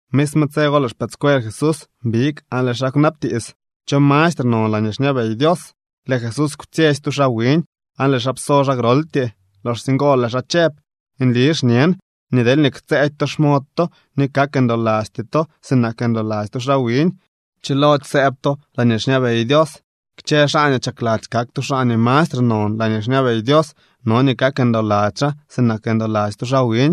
Misme tse go lëë xpëëdscuel Jesús big aan lëë xaa kwnabtiits: —¿Cho mastre non laañee xñabey Dios? Lëë Jesús kwtsyetsy tu xaa wiñ, aan lëë xaa pso xaa groltyee. Loxsye ngo lëë xaa chëb: —Nli xñen nii deelñee ktsëëdy to xmod to ni kak ndolasty to sinak ndoladzy tu xaa wiñ, chilody sëëb to laañee xñabey Dios. Kchë xaa nii chakladzy kak tu xaa nii mastre non laañee xñabey Dios no nii kak ndoladzy xaa sinak ndoladzy tu xaa wiñ.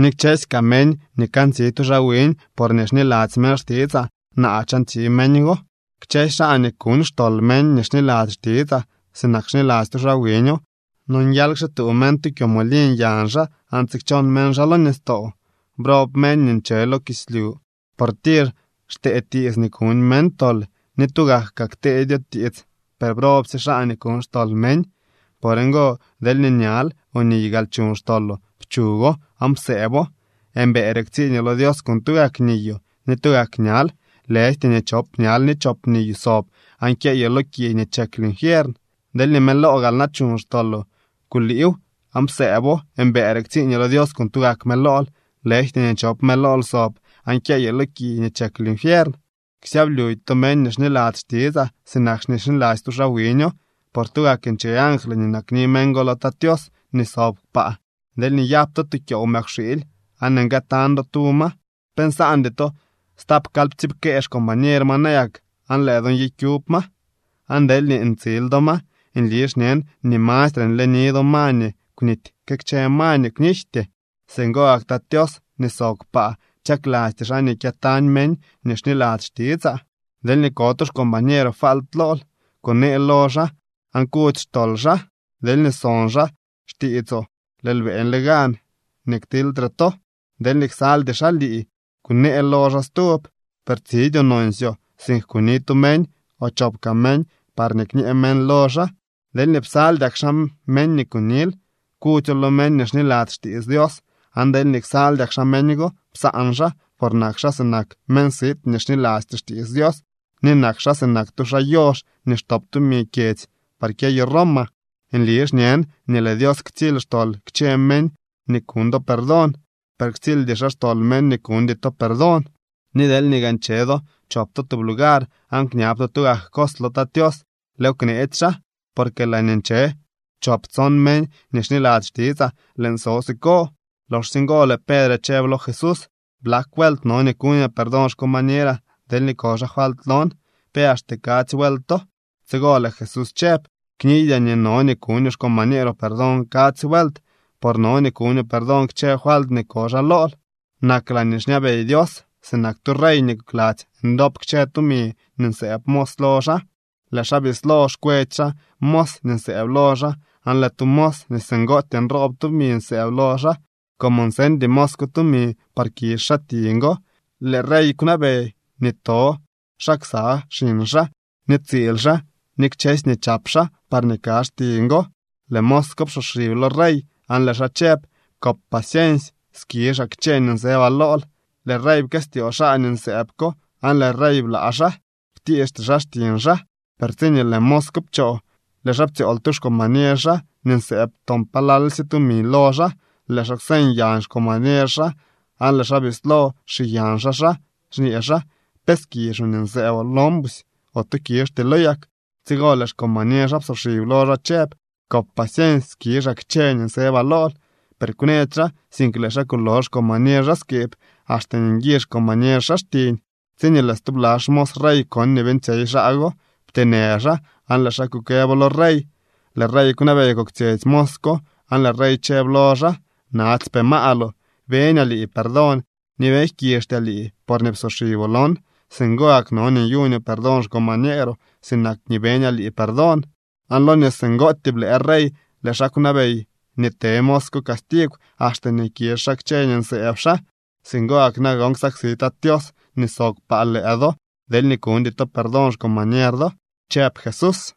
Ni kchësy kaa meñ nii kantsi tu xaa wiñ porñee xniladzy meñ xtitsaa, naa chantsi meñ go. ’Kchësy xaa nii kuñ xtol meñ nii xniladzy xtitsaa sinak xniladzy tu xaa wiño nonguial kxituu meñ tu kyomoliñ yañ xaa aan tsikchon meñ xaa lo nistoo. ¡Brob meñ nii nche lo kislyu, por tir xtee tiits nii kuñ meñ tol! Ni tugak kaa kteedyo tiits, per ¡brobsye xaa nii kuñ xtol meñ! ’Por ngo, deelñee ñal o niy gaal chuñ xtoloo, pchugo aan psëëbo. Mbëëre ktsiiñoo lo Dios con tugak niyoo ni tugak ñal, lëjty nii chop ñal ni chop niyoo sob aan kyeyoo lo ki nii chek linfiern. Deelñee mëloo gaal na chuñ xtoloo, kuliiw aan psëëbo. Mbëëre ktsiiñoo lo Dios con tugak mëlool, lëjty nii chop mëlool sob aan kyeyoo lo ki nii chek linfiern. ’Ksyablyudy to meñ ni xniladzy xtitsaa sinak xniladzy tu xaa wiño, por tugak nche angly nii nakni meñ go lo Tat Tios nii sob kpaa. ’Deelñee nyap to tu kyoow mëkwxiily aan nguëtañ do tu ma, ¿pe nsaandy to stapkalyptsiipkee xcombañer ma nayak aan lëë do nyikyub ma? Aan deelñee ntsil do ma, nli xñen nii mastre nleni do ma nii kwnity que kchë ma nii kwnijty. Singo gak Tat Tios nii sob kpaa chaklasty xaa nii kyëtañ meñ nii xniladzy xtitsaa. ’Deelñee ko tu xcombañeeroo falt lool, kunee lo xaa aan kudzy xtol xaa. Deelñee son xaa xtiitsoo lëël beeñle gan nii ktiilydre to. Deelñee ksaldy xaa lii, kunee lo xaa stub, per tsidyoo nonsyoo, sink kuni tu meñ o chop kaa meñ parñee kñee meñ lo xaa. Deelñee psaldyak xaa meñ nii kunil, kudzyo lo meñ nii xniladzy xtiits Dios, aan deelñee ksaldyak xaa meñ go, psaan xaa, por nak xaa sinak meñ sit nii xnilasty xtiits Dios, ni nak xaa sinak tu xaa yox nii xtop tumi kyedzy par kyeyo Roma. ’Nli xñen nii lëë Dios ktsily xtol kchë meñ nii kuñ do perdón, per ktsildy xaa xtol meñ nii kuñdy to perdón. ’Ni deelñee gaa nche do chop to tub lugar aan kñab to tugak cos lo Tat Tios, lëëw kneetsy xaa. Porque laañee nche choptson meñ nii xniladzy xtitsaa, lëën so siko. Loxsye ngo lëë Pedre chëb lo Jesús: —¿Blak vuelt no nii kuñaa perdón xcombañeraa deelñee ko xaa falt lon? ¿Pe axte kadzy vuelto? Tsigo lëë Jesús chëb: —Kniydyaa nii no nii kuñoo xcombañeeroo perdón kadzy vuelt, por no nii kuñoo perdón kchë falt nii ko xaa lool. ’Nak laañee xñabey Dios sinak tu rey nii kokladzy ndop kchë tumi nii nsëëb mos lo xaa. Lëë xaa bislo xkwetsy xaa mos nii nsëëb lo xaa aan lëë tu mos nii singootyee nroob tumi nsëëb lo xaa. Como nseñdy mos ko tumi par kizh xaa tiñ go, lëë rey kwnabey nii to xaa ksa xiñ xaa ni tsiil xaa ni kchësy nii chap xaa, parñee kazh tiñ go. Lëë mos ko psoxib lo rey aan lëë xaa chëb: “Kop paciensy, skizhaa kchë nii nsëbaa lool.” Lëë rey pkëstyoo xaa nii nsëëb ko aan lëë rey blaa xaa. Kwtiixty xaa xtiñ xaa. Per tsiñee lëë mos ko pchoo, lëë xaa ptsyool tu xcombañer xaa nii nsëëb toon palalsye tumi lo xaa. Lëë xaa kwseñ yañ xcombañer xaa aan lëë xaa bislo xiyañ xaa xaa, xñee xaa: “¿Pe skizhoo nii nsëëboo lon busy ote kizhtylo yak?” Tsigo lëë xcombañer xaa psoxib lo xaa chëb: “Kop paciensy, skizhaa kchë nii nsëbaa lool.” Per kwnëdy xaa, sink lëë xaa kulo xcombañer xaa skiib axte nii nguizh xcombañer xaa xtiñ. Tsiñee lëë stubla xmos rey kon nii beeñtsyey xaa go, pteenë xaa aan lëë xaa kukëbo lo rey. Lëë rey kwnabey koktsyetsy mos ko aan lëë rey chëb lo xaa: “¡Natsypee maaloo! Beñaa lii perdón ni beeñ jkizhtyaa lii porñee psoxiboo lon. Singo gak no nii nyuñoo perdón xcombañeeroo sinak nii beñaa lii perdón.” Aan lo nii singootyee blëë rey, lëë xaa kwnabey nii te mos ko castigw axte nii kizh xaa kchë nii nsëëb xaa. ’Singo gak nagon ksaksi Tat Tios nii sob kpaa lëë do, deelñee kuñdy to perdón xcombañer do —chëb Jesús.